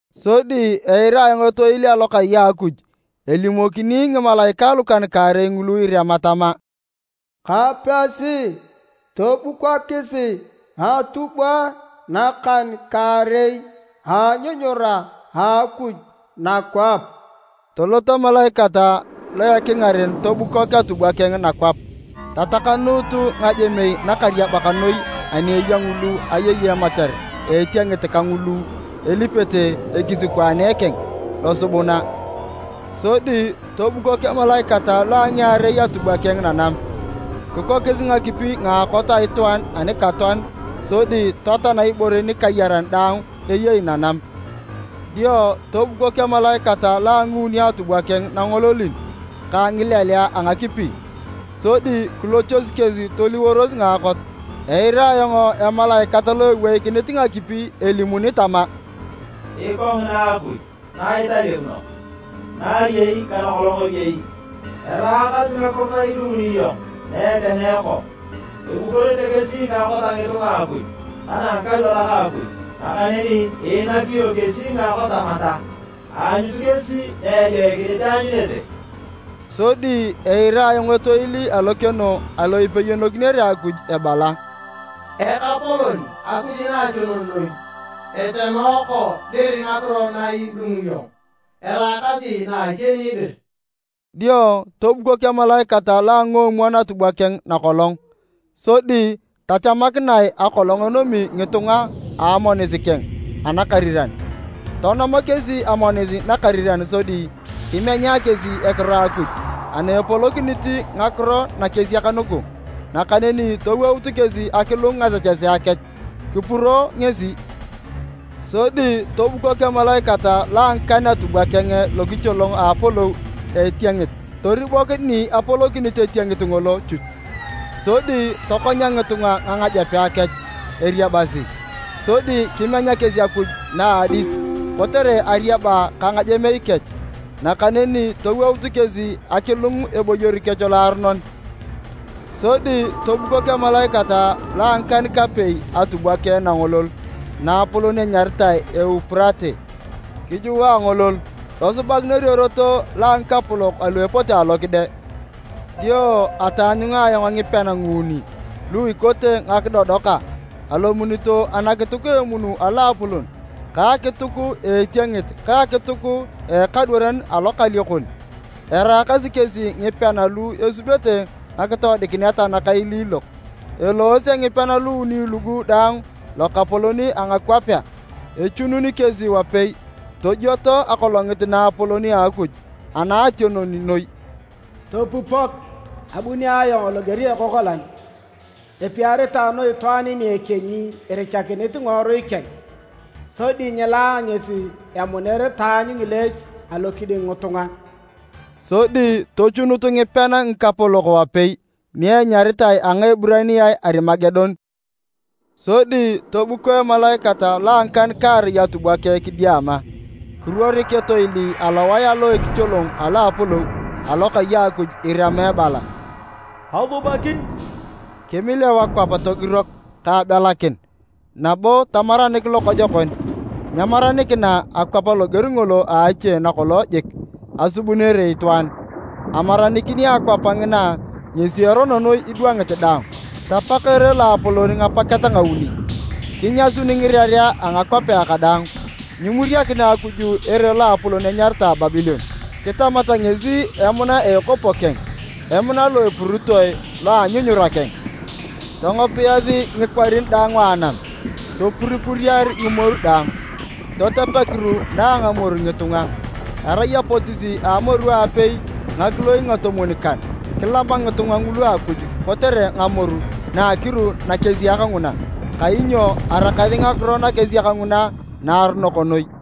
Sodi eira etoil alokai a Akuj elimokini ngimalaikae lukan-kaarei ngulu irema tama, “Kapesi tobukokisi ngatubwae nakan-kaarei a anyunyura a Akuj nakwap!” Tolot emalaikat lo a ekingaren tobukok atubwa keng nakwap. Tatakanuut ngajemei nakariabak noi ani eya ngulu ayei emachar a etiengit ka ngulu elipete ekisikwaane keng losubuna. Sodi tobukok emalaikat lo a ngiarei atubwa keng nanam. Kikokis ngakipi ngaakot a itwaan anikatoan sodi totoan ibore nikayaran daang eyei nanam. Dio tobukok emalaikat lo a nguuni atubwa keng nangololin ka ngileleae a ngakipi, sodi kilochos kesi toliworos ngaakot. Eira ayong emalaikat lo eweikinit ngakipi elimuni tama, “Ikongina Akuj na italeuno, na iyei ka nakolong iyei! Eraakasi ngakiro na idunguni iyong na etenooko. Abukorete kesi ngaakot a ngitunga a Akuj ka na a ngikadwarak a Akuj, nakaneni iinak iyong kesi ngaakot tamata. Aanyut kesi na ejoikinit eanyunete!” Sodi eira ayong etoil alokeno alo ipeyonokinere Akuj ebala, “Ekapolon Akuj Naationon Noi! Etenooko dir ngakiro na idunguni iyong eraakasi na iteni dir!” Dio tobukok emalaikat lo a nguomwon atubwa keng nakolong, sodi tachamakinae akolong enomi ngitunga a amonis keng anakariran. Tonom kesi amonis nakariran sodi kimenya kesi ekiro a Akuj ana epolokinit ngakiro nakesiak nugu. Nakaneni towout kesi akilung ngasechesea kech, kipuro ngesi. Sodi tobukok emalaikat lo a ngikan atubwa keng lokicholong a apolou a etiengit. Toribok ni apolokinit etiengit ngolo chuch, sodi tokonya ngitunga ngangajepa kech eriabasi, sodi kimenya kesi Akuj na a adis kotere ariaba ka ngajemei kech. Nakaneni towout kesi akilung eboyor kech loaronon. Sodi tobukok emalaikat lo a ngikan-kapei atubwa keng nangolol naapolon enyaritae Eupurate. Kijua angolol, tosubakinor erot lo a ngikapolok alu epote alokide. Dio ataanyunga ayong ngipean nguuni lu ikote ngakidodoka. Alomunito anakituk a emun aloapolon, ka akituk a etiengit ka akituk a ekadwaran alokaliokon. Eraakasi kesi ngipean alu esubete ngakitoodikinet nakailiilok. Eloose ngipean luuni lugu daang lokapolok a ngakwapea, echunun kesi wapei tojioto Akolongit naapolon a Akuj Anaationon Noi. “Topupok! Abuni ayong loger a ekokolan! Epiaritae noi itwaan ni ekienyi irichakinit ngiworui keng, sodi nyilaa ngesi emuner taanyu ngileech alokiding ngitunga!” Sodi tochunut ngipean ngikapolok wapei ni enyaritae a Ngaeburaniae Arimagedon. Sodi tobuko emalaikat lo a ngikan-kaarei atubwa keng kidiama. Kiruorik etoil alowae alo ekicholong alo a apolou, alokai a Akuj, irema ebala, “Asubakin!” Kimileu akwap togirok ka abelakin, nabo tamaranik lokojokon. Nyemaranikina akwap loger ngolo a ache nakolong jik asubunere itwaan, amaranikin a akwap ngina ngesi erono noi idwangit daang! Tapak ere loapolon ngapaket ngauni, kinyasun ngirerea a ngakwapea kadaang. Nyimuriakina Akuj ere loapolon enyaritae Babilon. Kitamat ngesi emuna a ekopo keng, emuna lo epuritoe lo a anyunyura keng. Tongopiyasi ngikwarin daang a anam, topuripuriakin ngimoru daang. Totep akiru na a ngamoru ngitunga, erai apotis a amoru a apei ngakiloi ngatomwon-kan, kilama ngitunga ngulu Akuj kotere ngamoru na akiru nakesiak nguna, kainyo araakasi ngakiro nakesiak nguna naaronok noi.